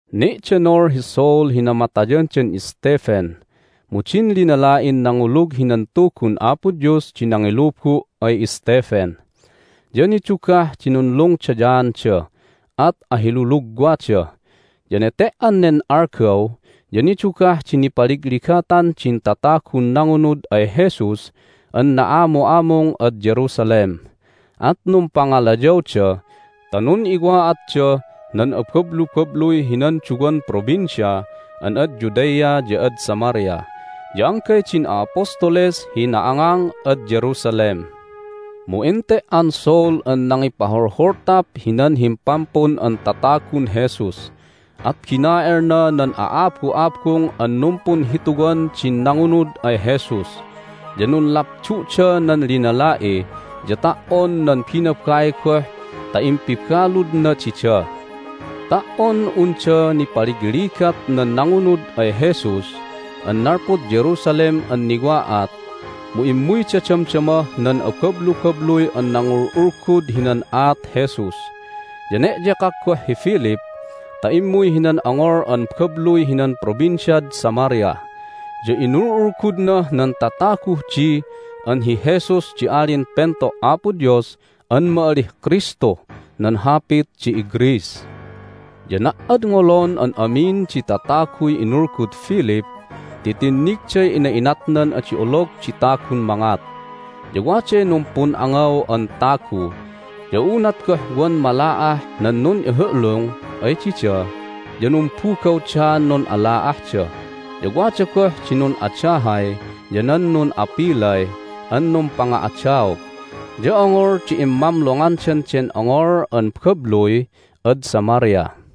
Ne'denol hi Saul hi namatayandan Stephen. Mu din linala'in nangulug hinan Tugun Apo Dios di nangilubu' ay Stephen, ya nidugah di nunlungdayaanda, at ahilulugwada. Ya nete"an nen algaw ya nidugah di nipaligligatan din tatagun nangunud ay Jesus an na'amu'amung ad Jerusalem. At numpangalayawda ta nun'iwa'atdah nan abablubabluy hinan duwan provincia an ad Judea ya ad Samaria, ya anggay din a'apostoles hi na'angang ad Jerusalem. Mu ente"an Saul an nangipaholholtap hinan Himpampun an Tatagun Jesus, at bina'elna nan a'abu'abung an numpunhituwan din nangunud ay Jesus. Ya nunlapdu'da nan linala'i, ya ta"on nan binabai goh ta impibaludna dida. Ta"on unda nipaligligat nan nangunud ay Jesus an nalpud Jerusalem an niwa'at mu immuyda damdamah nan abablubabluy an nangul'ulgud hinan aat Jesus. Ya ne'yekak goh hi Philip ta immuy hinan ongol an babluy hinan Provinciad Samaria, ya inul'ulgudnah nan tataguh di an hi Jesus di Alin Pento' Apo Dios an ma'alih Kristuh nan hapit di iGreece. Ya na"adngolon an amin di tataguy inulgud Philip ti tinnigday ina'inatnan adi olog di tagun mangat. Ya waday numpun'angaw an tagu, ya unat goh wan mala'ah nan nun'ihu'lung ay dida ya numbugawdaan nun'ala'ahda. Ya wada goh di nun'adahay ya nan nun'apilay an numpanga'adaog. Ya ongol di immamlongandan den ongol an babluy ad Samaria.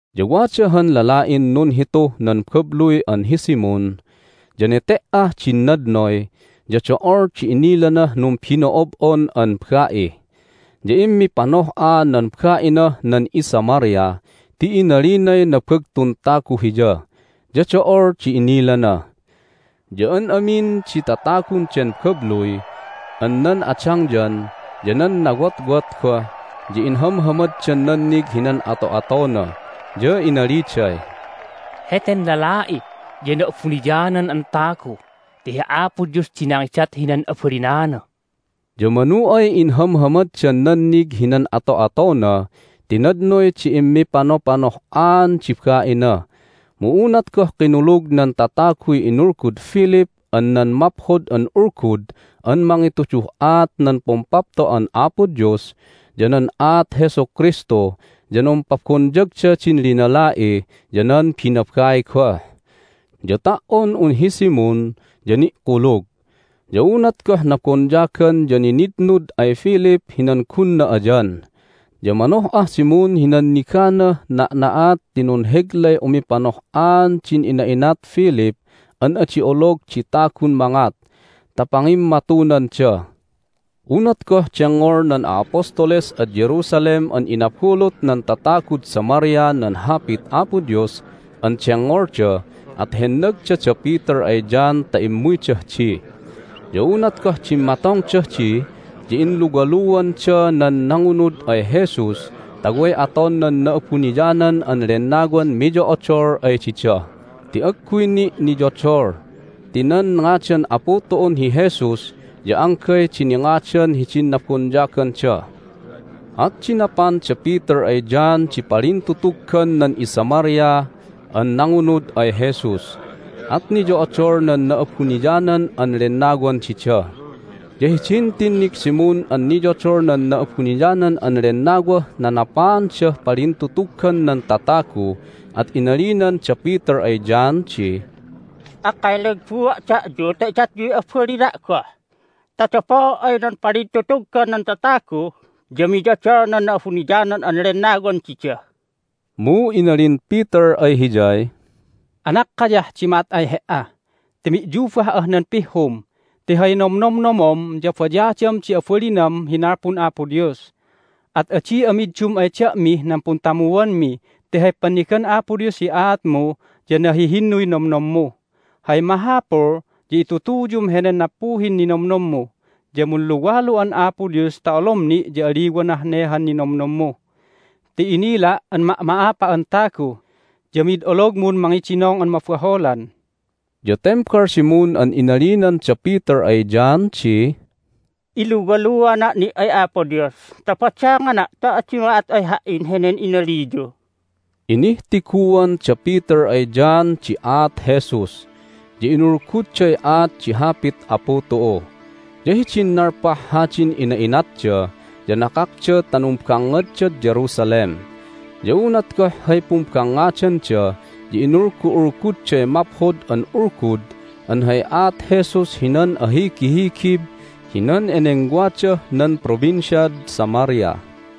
Ya wada han lala'in nunhituh nan babluy an hi Simon, ya nete"ah din nadnoy ya do'ol di inilanah numbino'ob'on an ba'i. Ya immipanoh'a nan ba'inah nan iSamaria ti inalinay nabagtun tagu hiya, ya do'ol di inilana. Ya an amin di tatagun den babluy an nan adangyan ya nan nawotwot goh ya inhamhamaddan nannig hinan ato'atona. Ya inaliday, "Heten lala'i ya na'abuniyanan an tagu ti hi Apo Dios di nangidat hinan abalinana!" Ya manu ay inhamhamaddan nannig hinan ato'atona ti nadnoy di immipanopanoh'aan di ba'ina. Mu unat goh kinulug nan tataguy inulgud Philip an nan Maphod an Ulgud an mangituduh aat nan Pumpapto'an Apo Dios ya nan aat Jesu Kristu ya numpabonyagda din linala'i ya nan binabai goh. Ya ta"on un hi Simon ya ni'kulug. Ya unat goh nabonyagan ya ninitnud ay Philip hinan gunna ayan, ya manoh'ah Simon hi nanniganah na'na'at ti nunheglay umipanoh'aan din ina'inat Philip an adi olog di tagun mangat ta pangimmatunanda. Unat goh dengngol nan a'apostoles ad Jerusalem an inabulut nan tatagud Samaria nan Hapit Apo Dios an dengngolda at hennagda da Peter ay John ta immuydah di. Ya unat goh dimmatongdah di ya inluwaluanda nan nangunud ay Jesus ta way aton nan Na'abuniyanan an Lennawan miyo'odol ay dida ti agguy ni' niyodol, ti nan ngadan Apu tu'un hi Jesus ya anggay di ningadan hidin nabonyaganda. At dinapan da Peter ay John di palintutuggan nan iSamaria an nangunud ay Jesus, at niyo'odol nan Na'abuniyanan an Lennawan dida. Ya hidin tinnig Simon an niyodol nan Na'abuniyanan an Lennawah nanapaandah palintutuggan nan tatagu at inalinan da Peter ay John di, "Akkay lagbua' da'yu ta idatyuy abalina' goh, ta dapoo' ay nan palintutuggan nan tatagu ya miyodol nan Na'abuniyanan an Lennawan dida!" Mu inalin Peter ay hiyay, "Anakkayah di ma'at ay he"a ti mi'yubah'ah nan pihhum ti hay nomnomnomom ya bayadam di abalinam hi nalpun Apo Dios! At adi'a middum ay da'mih nan puntamuanmi ti hay pannigan Apo Dios hi aatmu ya nahihinnuy nomnommu! Hay mahapul ya itutuyum henen nappuhin ninomnommu, ya munluwalu'an Apo Dios ta olom ni' ya aliwanah ne han ninomnommu. Ti inila' an ma'ma'apa'an tagu, ya mid ologmun mangidinong an mabaholan!" Ya tembal Simon an inalinan da Peter ay John di, "Iluwaluana' ni' ay Apo Dios ta badangana' ta adi ma'at ay ha"in henen inaliyu!" Inihtiguan da Peter ay John di aat Jesus, ya inulgudday aat di Hapit Apu tu'u. Ya hidin nalpah hadin ina'inatda ya nakakda ta numbangngaddad Jerusalem. Ya unat goh hay pumbangngadanda ya inulgu'ulgudday Maphod an Ulgud an hay aat Jesus hinan ahigihigib hinan enengwadah nan Provinciad Samaria.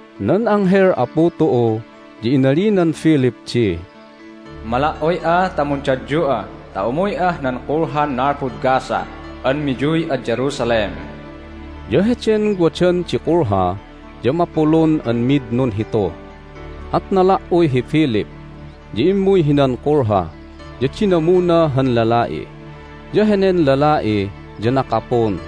Nan anghel Apu tu'u ya inalinan Philip di, "Mala"uy'a ta mundadyu'a ta umuy'ah nan kulhan nalpud Gaza an miyuy ad Jerusalem." Ya heden wadan di kulha ya mapulun an mid nunhitu. At nala"uy hi Philip, ya immuy hinan kulha, ya dinamuna han lala'i. Ya henen lala'i ya nakapun,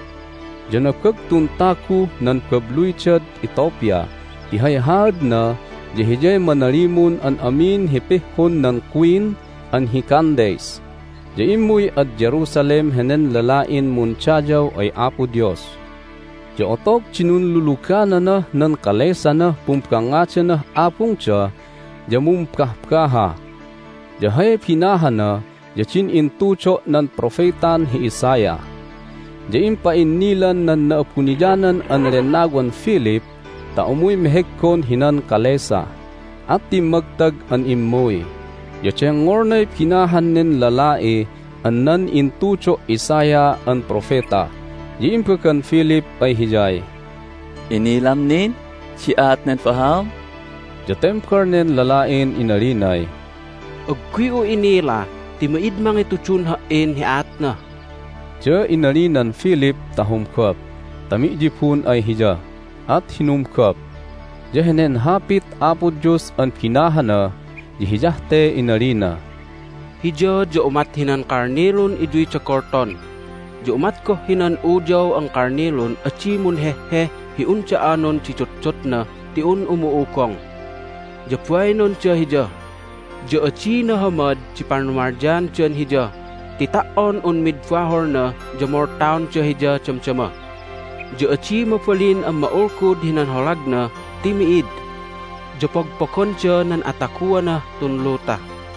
ya nabagtun taguh nan babluydad Ethiopia ti hay haadna ya hiyay manalimun an amin hi pihhun nan Queen an hi Candace. Ya immuy ad Jerusalem henen lala'in mundayaw ay Apo Dios. Ya otog di nunlulugananah nan kalesanah pumbangngadanah abungda ya mumbahbaha, ya hay binahana ya din intudo' nan propetan hi Isaiah. Ya impa'innilan nan Na'abuniyanan an Lennawan Philip ta umuy meheggon hinan kalesa. At timmagtag an immuy, ya dengngolnay binahan nen lala'i an nan intudo' Isaiah an propeta. Ya imbagan Philip ay hiyay, "Inilam nin di aat nen bahaom?" Ya tembal nen lala'in inalinay, "Agguy'u inila ti mid mangitudun ha"in hi aatna." Ya inalinan Philip ta humgop ta mi'yibun ay hiya, at hinumgop. Ya henen Hapit Apo Dios an binahana ya hiyah te inalina: "Hiya ya umat hinan kalnilun iyuyda golton, ya umat goh hinan uyaw an kalnilun adi munheheh hi unda anon di dutdutna ti un umu'ugong. Ya bainonda Hiya, ya adi nahamad di panumalyaandan Hiya ti ta"on un mid baholna ya moltaonda Hiya damdama. Ya adi mabalin an ma'ulgud hinan holagna ti mi'id, ya pogpogonda nan ataguanah tun luta."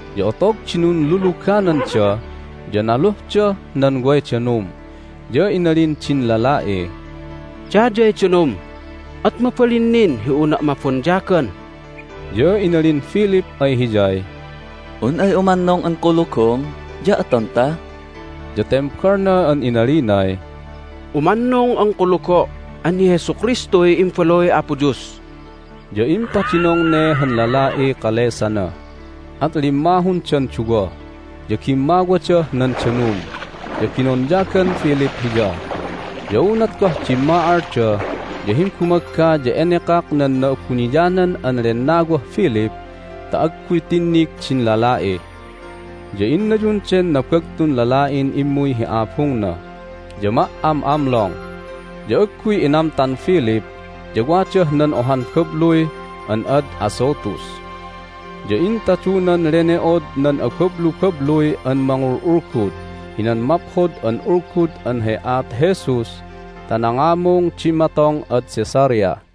Ya otog di nunlulugananda ya naluhdah nan way danum. Ya inalin din lala'iy, "Dayay danum! At mabalin nin hi unna' mabonyagan?" Ya inalin Philip ay hiyay, "Un ay umannung an kulugom ya atonta." Ya tembalna an inalinay, "Umannung an kulugo' an hi Jesu Kristuy Imbaluy Apo Dios!" Ya impadinong ne han lala'iy kalesana, at limmahundan duwa, ya gimmawadah nan danum, ya binonyagan Philip hiya. Ya unat goh dimma'alda ya himbumagga ya enekak nan Na'abuniyanan an Lennawah Philip ta agguy tinnig din lala'i. Ya innayun den nabagtun lala'in immuy hi abungna, ya ma"am'amlong. Ya agguy inamtan Philip ya wadah nan ohan babluy an ad Azotus. Ya intadunan lene'od nan abablubabluy an mangul'ulgud hinan Maphod an Ulgud an hay aat Jesus ta nangamung dimmatong ad Caesarea.